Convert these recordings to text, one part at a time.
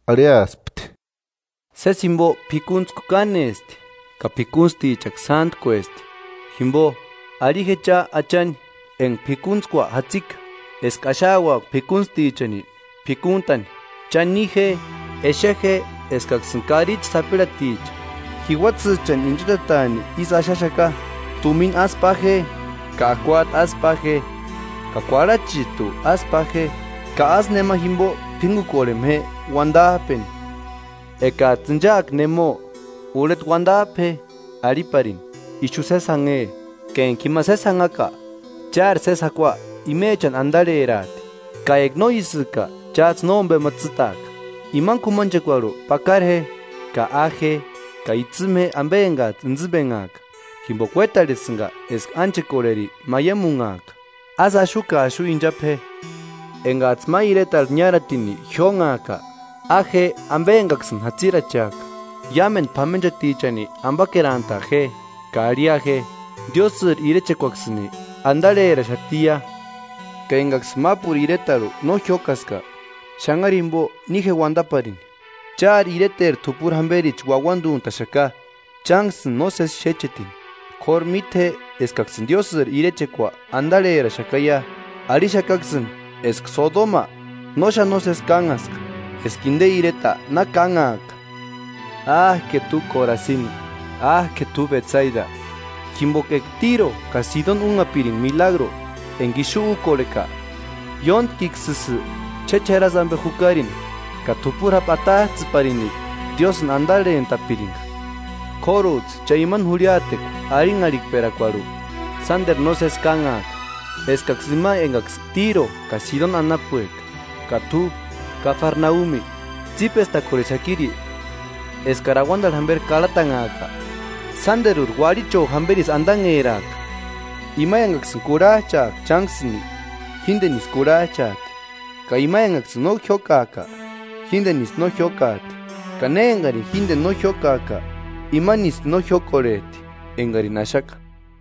Arhiaspti: “Sési jimbo p'ikuntskua kánesti, ka p'ikuntstichaksï sántkuesti. Jimbo, arhi je cha Achani enga p'ikuntskua jatsika eska axauaka p'ikuntstichani p'ikuntani. Cha ni je; exe je eskaksïni karichi sapirhati, jiuatsïchani inchachataani isï axaxaka. Tumina ásï pa je ka akuajtu ásï pa je, ka kuarhachijtu ásï pa je; ka ásï nemani jimbo p'íngukorhema je uandajpeni. Ekajtsï inchajka nemo, urheta uandajpe je, arhiparini: ‘Ixu sési jánhe,’ Ka enga jima sési janhaka, chári sési jakua imechani andarheraati; ka eka no ísïka chájtsï nómbema tsîtaaka. Imani k'umanchekuarhu pakara je ka a je ka itsïma je ambe engajtsï intsïmbenhajka, jimboka uétarhesïnga eska ánchekorheri maiamunhaaka. Ásï axu ka axu inchapu je. Engajtsï ma iretarhu niáratini jiónhaaka, a je ambe engaksïni jatsiracheaka; iámendu p'amenchatichani ambakerantaa je, ka arhia je: ‘Diósïri irechekuaksïni andarheraxatiia.’ Ka engaksïni mápuru iretarhu no jiókaska, xanharu jimbo ni je uandaparini: ‘¡Chári ireteri t'upuri jamberichi uauanduntaxaka chánksïni nósesi xécheni! K'óru míte je eskaksïni Diósïri irechekua andarheraxakaia.’ Arhixakaksïni eska Sodoma no xáni nósesi kánhaska eska inde ireta na kánhaaka.” “¡Áke t'u Korasini! ¡Áke t'u Betsaida! Jimboka eka Tiro ka Sidoni únhapiringa milagru enga ixu úkorheka, ióntkiksïsï ch'ech'erasï ambe jukarini ka t'upuri japu atajtsïparini Diósïni andarhentapiringa. K'órujtsï cha imani jurhiatekua arhinharhikperakuarhu sánderu nósesi kánhaaka, eskaksï ima engaksï Tiro ka Sidoni anapueka. Ka t'u, Kafarnaumi, ¿Tsípestakorhexakiri eskari auandarhu jamberi karhatanhaaka? ¡Sánderuri uarhicho jamberisï andanheraaka!” “Ima engaksïni kurhajchajka chánksïni, jíndenisï kurhajchajti; ka ima engaksïni no jiókajka, jíndenisï no jiókajti; ka ne engarini jíndeni no jiókajka, imanisï no jiókorhejti engarini axaka.”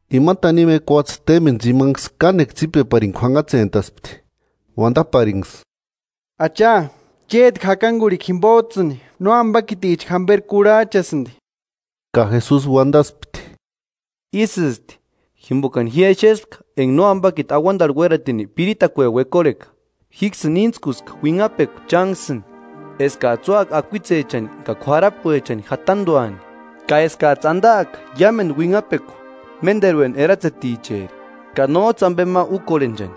Ima tanimu ekuatse témbeni tsimanksï kánekua tsípeparini k'uanhatsentaspti, uandaparinksï: –¡Acha, chéti jakangurhikuani jimbojtsïni nóambakiticha jamberi kurhajchasïndi! Ka Jesusi uandaspti: –Ísïsti, jimbokani ji exespka enga Nóambakiti auandarhu uératini piritakueni uekorheka. Jíksïni íntskuska uinhapekua chánksïni eskajtsï úaka akuitsechani ka k'uarapuechani jatanduani, ka eskajtsï andaaka iámendu uinhapekua ménderueni eratseticheri, ka nójtsï ambe ma úkorhenchani.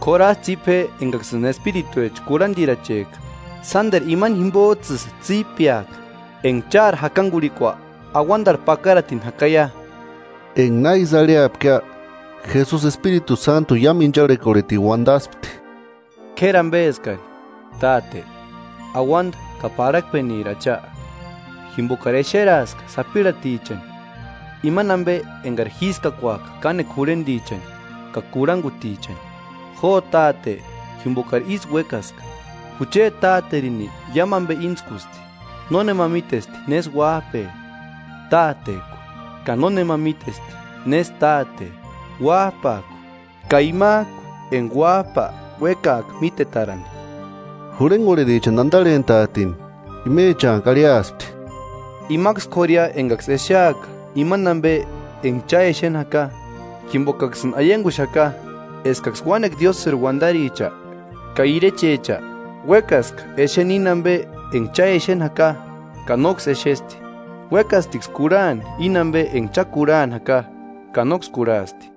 K'óru ásï tsípe je engaksïni espirituecha kurhandirachejka, sánderu imani jimbojtsïsï tsípeaka enga chári jakangurhikua auandarhu pakaratini jakaia. Enga na ísï arhiapkia, Jesusi Espiritu Sántuni iámu incharhekorhetini uandaspti: “K'éri ambeskari, Táte, auanda ka parhakpeniri Acha, jimbokari exeraaska sapirhatichani imani ambe engari jískakuaka kánekua jurhendichani ka kurhangutichani. Jo Táte jimbokari ísï uékaska.” “Jucheti Táterini iámu ambe íntskusti. Nónema mítesti nésï uájpe, Tátejku; ka nónema mítesti nésï Táte, Uájpajku ka imajku enga Uájpa uékaaka mítetarani.” Jurhengorherichani andarhentaatini imechanku arhiaspti: “Imaksï k'ória engaksï exeaka imani ambe enga cha exeni jaka; jimbokaksïni aianguxaka eskaksï uánekua Diósïri uandaricha ka irechecha uékaska exeni íni ambe enga cha exeni jaka, ka nóksï exesti; uékastiksï kurhani íni ambe enga cha kurhani jaka ka nóksï kurhasti.”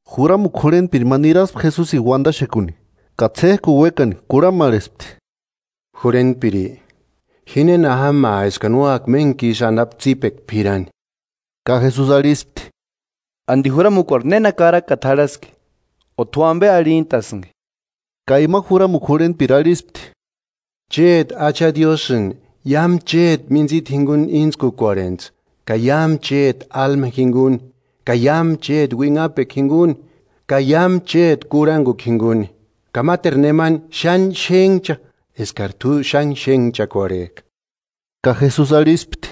Juramukua jurhentpiri ma niraspti Jesusini uandaxekuni, ka ts'éjkuni uékani kurhamarhespti: –Jurhentpiri, ¿Ji néna jámaa eskani úaka méntku isï anapu tsípekua p'irani? Ka Jesusi arhispti: –¿Andi juramukuarhu néna karakata jarhaski? ¿O t'u ambe arhintasïnki? Ka ima juramukua jurhentpiri arhispti: Chéti Acha Diósïni iámu chéti mintsita jinguni íntskukorhentsï ka iámu chéti álma jinguni ka iámu chéti uinhapekua jinguni ka iámu chéti kurhangukua jinguni; ka máteru nemani xáni xénhcha eskari t'u xáni xénhchakorhejka. Ka Jesusi arhispti: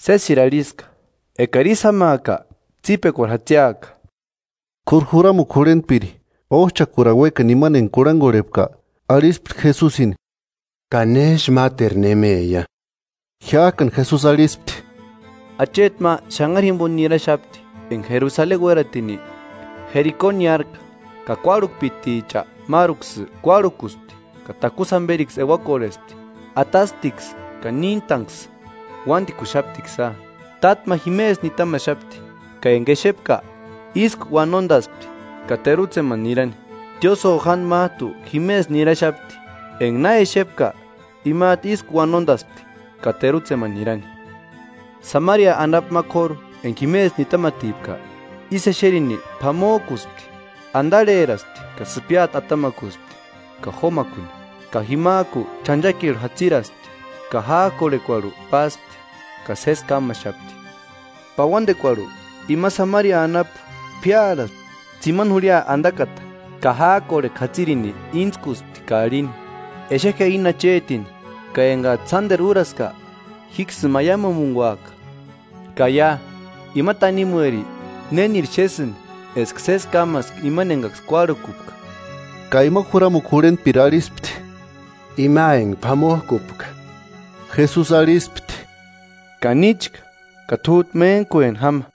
–Sésiri arhiska. Ekari ísï jámaaka tsípekuari jatsiaka. K'óru juramukua jurhentpiri, ójchakurani uékani imani enga kurhangorhepka, arhispti Jesusini: –¿Ka nésï máteru nemeia? Jimajkani Jesusi arhispti: –Acheti ma xanhari jimbo niraxapti enga Jerusaleni uératini Jeriko niárajka, ka kuárhukpiticha máruksï kuárhukuspti ka takusï jamberiksï euakorhespti; atasptiksï ka níntanksï, uándikuxaptiksïa. Táta ma jimesï nitamaxapti; ka enga exepka, ísku uanondaspti ka terutsemani nirani. Tiósïo jándi májtu jimesï niraxapti, enga na exepka, imajtu ísku uanondaspti ka terutsemani nirani. Samaria anapu ma k'óru enga jimesï nitamatipka, ísï exerini p'amojkuspti. Andarheraspti ka sïpiati atamakuspti ka jomakuni. Ka jimajku ch'anchakirhu jatsiraspti ka jájkorhekuarhu páspti ka sési kámaxapti. Pauandekuarhu, ima Samaria anapu p'íarhaspti tsimani jurhia andakata ka jájkorhekua jatsirini íntskuspti ka arhini: Exe je íni achetini, ka engajtsï sánderu úraska, jíksïni maiamumunguaka. Ka ia, ¿Ima tanimueri, néniri xésïnki eska sési kámaska imani engaksï kuárhukupka? Ka ima juramukua jurhentpiri arhispti: –Ima enga p'amojkupka. Jesusi arhispti: –Ka níchka, ka t'újtu méntkueni jáma.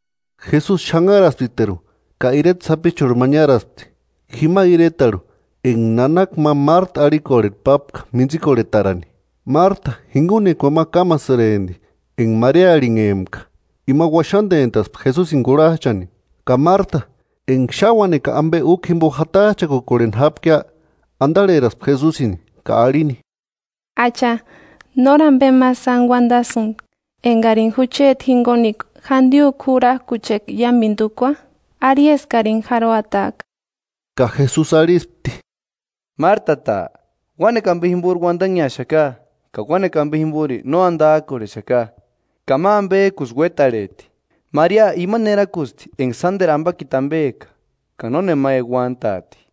Jesusi xanharasptiteru ka ireta sapichurhu ma niáraspti, jima iretarhu enga nanaka ma Márta arhikorhe pápka mintsikorhetarani. Márta jingunekuani ma kámasïrempti enga Maria arhinhempka, ima uaxandentaspti Jesusini kurhajchani. Ka Márta, enga xáni uánekua ambe úkua jimbo jatajchakukorheni jápkia, andarheraspti Jesusini ka arhini: –Acha, ¿Nóri ambe ma sáni uandasïnki engarini jucheti jingunekua jandiojku jurarkucheka iámendu úkua? Arhi eskarini jarhuataaka. Ka Jesusi arhispti: –¡Mártata! Uánekua ambe jimbori uandanheaxaka ka uánekua ambe jimbori no andajkorhexaka, ka ma ambejkusï uétarhejti. Maria imani erakusti enga sánderu ambakiti ambeka, ka nónema euantaati.